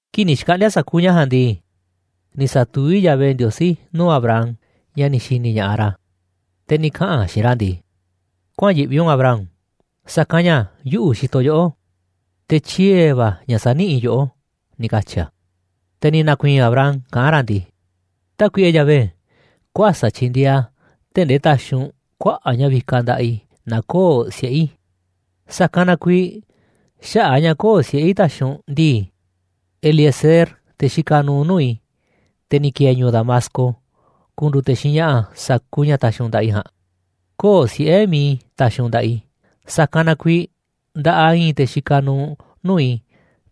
Kii̱ꞌ ni̱ xkaꞌndi̱a̱ sa̱kuuꞌ ña̱ ja̱a̱nꞌ ndii, ni̱ sa̱tuví Yahvé Ndiosí nuu̱ꞌ Abram, ña̱ ni̱ xi̱ni̱ ña̱ꞌaꞌ ra̱, te̱ ni̱ kaꞌa̱n a̱ xiinꞌ ra̱ ndii: ―Kuäa̱n yiꞌvi u̱nꞌ Abram, sa̱kanꞌ ña̱ yuꞌu̱ xitoꞌ yoꞌó, te̱ tyie̱ va̱ ña̱ sa̱niꞌíꞌ i̱ yoꞌó ―ni̱ katyi̱ a̱. Te̱ ni̱ na̱ku̱i̱i̱n Abram kaꞌán ra̱ ndii: ―Tákuiꞌe Yahvé, kuäsa̱ꞌ tyi̱ndi̱e̱eꞌ a̱ tee̱ꞌ ndee ta̱xi̱ u̱nꞌ kuaꞌa̱ꞌ ña̱ vikaꞌ nda̱ꞌaꞌ i̱ naaꞌ köo̱ꞌ siꞌe̱ i̱. Sa̱kanꞌ na kuiiꞌ xaꞌa̱ꞌ a̱ ña̱ köo̱ꞌ siꞌe̱ i̱ taxiꞌ u̱nꞌ ndii, Eliezer, te̱ xikaꞌ nuuꞌ nuu̱ꞌ i̱, te̱ ni̱ ki̱e̱e̱ ñu̱u̱ Damasco, ku̱ndu̱u̱ te̱ xiinꞌ ña̱ꞌa̱ sa̱kuuꞌ ña̱ ta̱xi̱ u̱nꞌ nda̱ꞌaꞌ i̱ ja̱a̱nꞌ. Köo̱ꞌ siꞌe̱ mi̱iꞌ i̱ taxiꞌ u̱nꞌ nda̱ꞌaꞌ i̱, sa̱kanꞌ na kuiiꞌ nda̱ꞌaꞌ i̱i̱n te̱ xikaꞌ nuuꞌ nuu̱ꞌ i̱,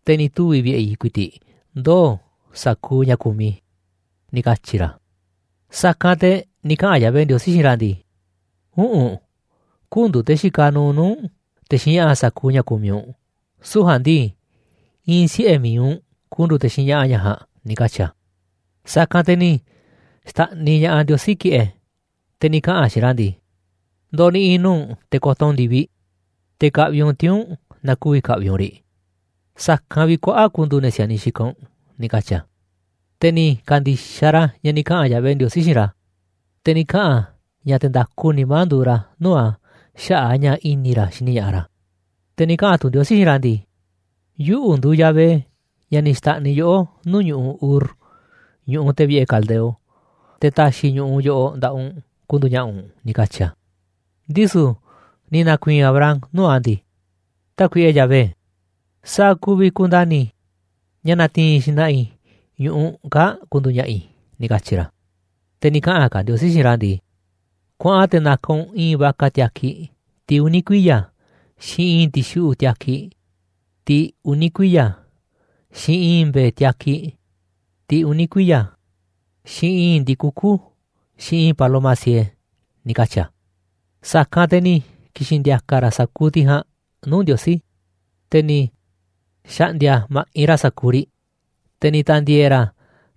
te̱ ni̱ tuvi̱ vi̱ꞌe̱ i̱ ku̱i̱ti̱ꞌ ndoo̱ sa̱kuuꞌ ña̱ kumiꞌ i̱ ―ni̱ katyi̱ ra̱. Sa̱kanꞌ te̱ ni̱ kaꞌa̱n Yahvé Ndiosí xiinꞌ ra̱ ndii: ―Üꞌu̱nꞌ, kü̱ndu̱u̱ te̱ xikaꞌ nuuꞌ nuu̱ꞌ u̱nꞌ, te̱ xiinꞌ ña̱ꞌa̱ sa̱kuuꞌ ña̱ kumiꞌ u̱nꞌ, süu̱ꞌ ja̱a̱nꞌ ndii, i̱i̱n siꞌe̱ mi̱iꞌ u̱nꞌ ku̱ndu̱u̱ te̱ xiinꞌ ña̱ꞌa̱ ña̱ ja̱a̱nꞌ ―ni̱ katyi̱ a̱. Sa̱kanꞌ te̱ ni̱ xta̱ꞌniꞌ ña̱ꞌaꞌ Ndiosí ki̱ꞌe̱, te̱ ni̱ kaꞌa̱n a̱ xiinꞌ ra̱ ndii: ―Ndo̱ni̱ꞌi̱ nuu̱ꞌ u̱nꞌ te̱ ko̱to̱ u̱nꞌ ndi̱viꞌ, te̱ ka̱ꞌvi̱ u̱nꞌ tiuu̱nꞌ naaꞌ ku̱vi̱ ka̱ꞌvi̱ u̱nꞌ riꞌ. Sa̱kanꞌ vi̱ꞌ kuaꞌa̱ꞌ ku̱ndu̱u̱ ne̱ si̱a̱niꞌ xikaꞌ u̱nꞌ ―ni̱ katyi̱ a̱. Te̱ ni̱ ka̱ndi̱xaꞌ ra̱ ña̱ ni̱ kaꞌa̱n Yahvé Ndiosí xiinꞌ ra̱, te̱ ni̱ kaꞌa̱n a̱ ña̱ te̱ nda̱ku nimá nduuꞌ ra̱ nuu̱ꞌ a̱ xaꞌa̱ꞌ a̱ ña̱ i̱ni̱ ra̱ xini ña̱ꞌaꞌ ra̱. Te̱ ni̱ kaꞌa̱n tu̱ Ndiosí xiinꞌ ra̱ ndii: ―Yuꞌu̱ nduuꞌ Yahvé, ña̱ ni̱ xta̱ꞌniꞌ yoꞌó nuu̱ꞌ ñu̱ꞌuꞌ Ur, ñu̱ꞌuꞌ te̱ vi̱ꞌe̱ Caldeo, te̱ ta̱xi̱ i̱ ñu̱ꞌuꞌ yoꞌoꞌ nda̱ꞌaꞌ u̱nꞌ ku̱ndu̱u̱ ña̱ꞌa̱ u̱nꞌ ―ni̱ katyi̱ a̱. Ndisu̱ ni̱ na̱ku̱i̱i̱n Abram nuu̱ꞌ a̱ ndii: ―Tákuiꞌe Yahvé, ¿sa̱a̱ ku̱vi̱ ku̱nda̱ni̱ i̱ ña̱ na̱ti̱i̱n xna̱ꞌa̱ i̱ ñu̱ꞌuꞌ kaa̱ꞌ ku̱ndu̱u̱ ña̱ꞌa̱ i̱ ―ni̱ katyi̱ ra̱. Te̱ ni̱ kaꞌa̱n ka̱ Ndiosí xiinꞌ ra̱ ndii: ―Kuaꞌan te̱ na̱ka̱ u̱nꞌ i̱i̱n vaca tiakiꞌ, tiꞌ uni̱ kuiya̱, xiinꞌ i̱i̱n ti̱xuꞌu̱ꞌ tiakiꞌ, tiꞌ uni̱ kuiya̱, xiinꞌ i̱i̱n mbe̱e̱ tiakiꞌ, tiꞌ uni̱ kuiya̱, xiinꞌ i̱i̱n ndi̱kukú, xiinꞌ i̱i̱n paloma siee ―ni̱ katyi̱ a̱. Sa̱kanꞌ te̱ ni̱ ki̱xi̱n ndi̱a̱ka̱ ra̱ sa̱kuuꞌ tiꞌ ja̱a̱nꞌ nuu̱ꞌ Ndiosí, te̱ ni̱ xa̱ꞌndi̱a̱ ma̱ꞌinꞌ ra̱ sa̱kuuꞌ riꞌ, te̱ ni̱ ta̱ndi̱e̱e̱ ra̱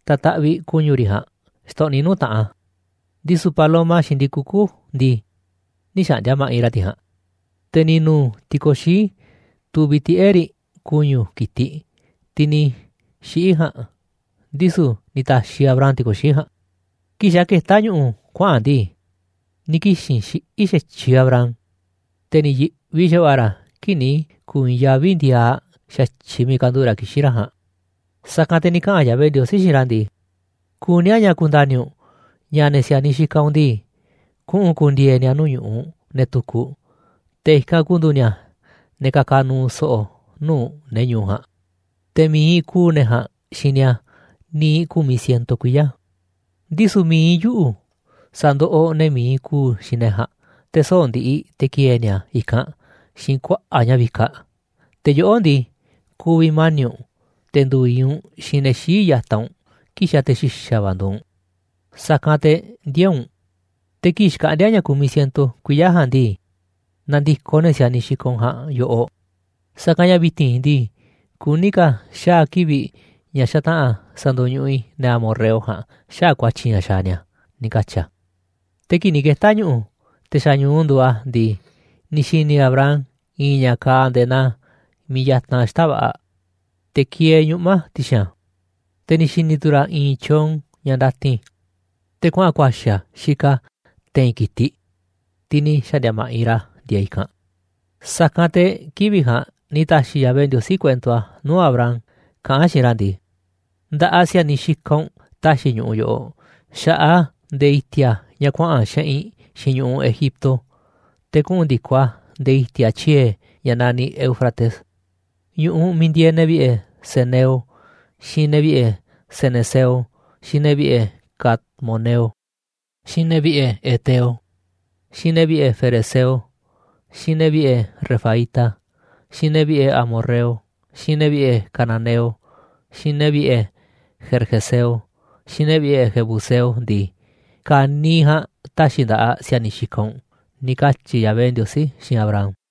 ta̱taꞌviꞌ ku̱ñu̱ riꞌ ja̱a̱nꞌ xtoꞌniꞌ nuu̱ꞌ taꞌan a̱, ndisu̱ paloma xiinꞌ ndi̱kukú ndii, nï̱ xa̱ꞌndi̱a̱ ma̱ꞌinꞌ ra̱ tiꞌ ja̱a̱nꞌ. Te̱ ni̱ nu̱u̱ ti̱ko̱xií tuviꞌ tiꞌe̱ꞌ riꞌ ku̱ñu̱ ki̱tiꞌ, tiꞌ ni̱ xiꞌi̱ ja̱a̱nꞌ, ndisu̱ ni̱ ta̱xiꞌ Abram ti̱ko̱xií ja̱a̱nꞌ. Kii̱ꞌ xa̱ ketá ñu̱ꞌu̱ kuaꞌa̱n a̱ ndii, ni̱ kixi̱n xiꞌí xa̱tyiꞌ Abram, te̱ ni̱ yi̱ꞌvi xa̱va̱ꞌa̱ ra̱ kii̱ꞌ ni̱ ku̱u̱ i̱i̱n yaví ndiaaꞌ xa̱tyiꞌ miiꞌ kanduꞌu̱ꞌ ra̱ kixín ra̱ ja̱a̱nꞌ. Sa̱kanꞌ te̱ ni̱ kaꞌa̱n Yahvé Ndiosí xiinꞌ ra̱ ndii: ―Kuní a̱ ña̱ ku̱nda̱ni̱ u̱nꞌ ña̱ ne̱ si̱a̱niꞌ xikaꞌ u̱nꞌ ndii, kuꞌu̱n ku̱ndi̱e̱e̱ ni̱a̱ nuu̱ꞌ ñu̱ꞌuꞌ ne̱ tukuꞌ, te̱ i̱kanꞌ ku̱ndu̱u̱ ni̱a̱ ne̱ ka̱ka̱ nu̱u̱ so̱ꞌo̱ nuu̱ꞌ ne̱ ñu̱u̱ ja̱a̱nꞌ, te̱ mi̱iꞌ ku̱u̱ ne̱ ja̱a̱nꞌ xiinꞌ ni̱a̱ niiꞌ ku̱miꞌ ciento kuiya̱. Ndisu̱ mi̱iꞌ yuꞌu̱ sa̱ndoꞌoꞌ ne̱ mi̱iꞌ ku̱u̱ xiinꞌ ne̱ ja̱a̱nꞌ, te̱ soꞌo̱ꞌ ndiꞌiꞌ te̱ ki̱e̱e̱ ni̱a̱ i̱kanꞌ xiinꞌ kuaꞌa̱ꞌ ña̱ vikaꞌ. Te̱ yoꞌó ndii, ku̱vi̱ mani̱ꞌ u̱nꞌ, te̱ ndu̱u̱ i̱i̱n u̱nꞌ xiinꞌ te̱ xii̱ꞌ ya̱taꞌ u̱nꞌ kii̱ꞌ xa̱ te̱ xi̱xa̱ va̱ nduuꞌ u̱nꞌ, sa̱kanꞌ te̱ ndiee̱ u̱nꞌ. Te̱ kii̱ꞌ xkaꞌndi̱a̱ ña̱ ku̱miꞌ ciento kuiya̱ ja̱a̱nꞌ ndii, na̱ndi̱koꞌ ne̱ si̱a̱niꞌ xikaꞌ u̱nꞌ ja̱a̱nꞌ yoꞌoꞌ, sa̱kanꞌ ña̱ vi̱ti̱n ndii, kuní ka̱ xaa̱ kivi̱ꞌ ña̱ xataꞌa̱n sa̱ndo̱ñuꞌuꞌ i̱ ne̱ amorreo ja̱a̱nꞌ xaꞌa̱ꞌ ku̱a̱tyi̱ ña̱ xaaꞌ ni̱a̱ ―ni̱ katyi̱ a̱. Te̱ kii̱ꞌ ni̱ keta̱ ñu̱ꞌu̱, te̱ xa̱ ñu̱u nduuꞌ a̱ ndii, ni̱ xi̱ni̱ Abram i̱i̱n ña̱ kaaꞌ nde̱e̱ naa miiꞌ yatanꞌ xita̱ꞌ va̱ꞌa̱, te̱ kieeꞌ ñuꞌma̱ ti̱xi̱n a̱, te̱ ni̱ xi̱ni̱ tu̱ ra̱ i̱i̱n tyoon ña̱ ndatin, te̱ kuaꞌa̱n ku̱a̱xi̱ a̱ xikaꞌ a̱ te̱i̱n ki̱tiꞌ, tiꞌ ni̱ xa̱ꞌndi̱a̱ ma̱ꞌinꞌ ra̱ ndieeꞌ i̱kanꞌ. Sa̱kanꞌ te̱ kivi̱ꞌ ja̱a̱nꞌ ni̱ ta̱xi̱ Yahvé Ndiosí kuento a̱ nuu̱ꞌ Abram, kaꞌán a̱ xiinꞌ ra̱ ndii: ―Nda̱ꞌaꞌ si̱a̱niꞌ xikaꞌ u̱nꞌ ta̱xi̱ i̱ ñu̱ꞌuꞌ yoꞌoꞌ, xa̱ꞌaꞌ a̱ nde̱e̱ i̱ti̱a̱ ña̱ kuaꞌa̱n xeꞌinꞌ xiinꞌ ñu̱ꞌuꞌ Egipto, te̱ kuꞌu̱n ndi̱koꞌ a̱ nde̱e̱ i̱ti̱a̱ tyie̱, ña̱ naniꞌ Éufrates. Ñu̱ꞌuꞌ miiꞌ ndieeꞌ ne̱ vi̱ꞌe̱ ceneo, xiinꞌ ne̱ vi̱ꞌe̱ cenezeo, xiinꞌ ne̱ vi̱ꞌe̱ cadmoneo, xiinꞌ ne̱ vi̱ꞌe̱ heteo, xiinꞌ ne̱ vi̱ꞌe̱ ferezeo, xiinꞌ ne̱ vi̱ꞌe̱ refaíta, xiinꞌ ne̱ vi̱ꞌe̱ amorreo, xiinꞌ ne̱ vi̱ꞌe̱ cananeo, xiinꞌ ne̱ vi̱ꞌe̱ gergeseo, xiinꞌ ne̱ vi̱ꞌe̱ jebuseo ndii, ka̱niiꞌ ja̱a̱nꞌ ta̱xi̱ i̱ nda̱ꞌaꞌ si̱a̱niꞌ xikaꞌ u̱nꞌ ―ni̱ katyi̱ Yahvé Ndiosí xiinꞌ Abram.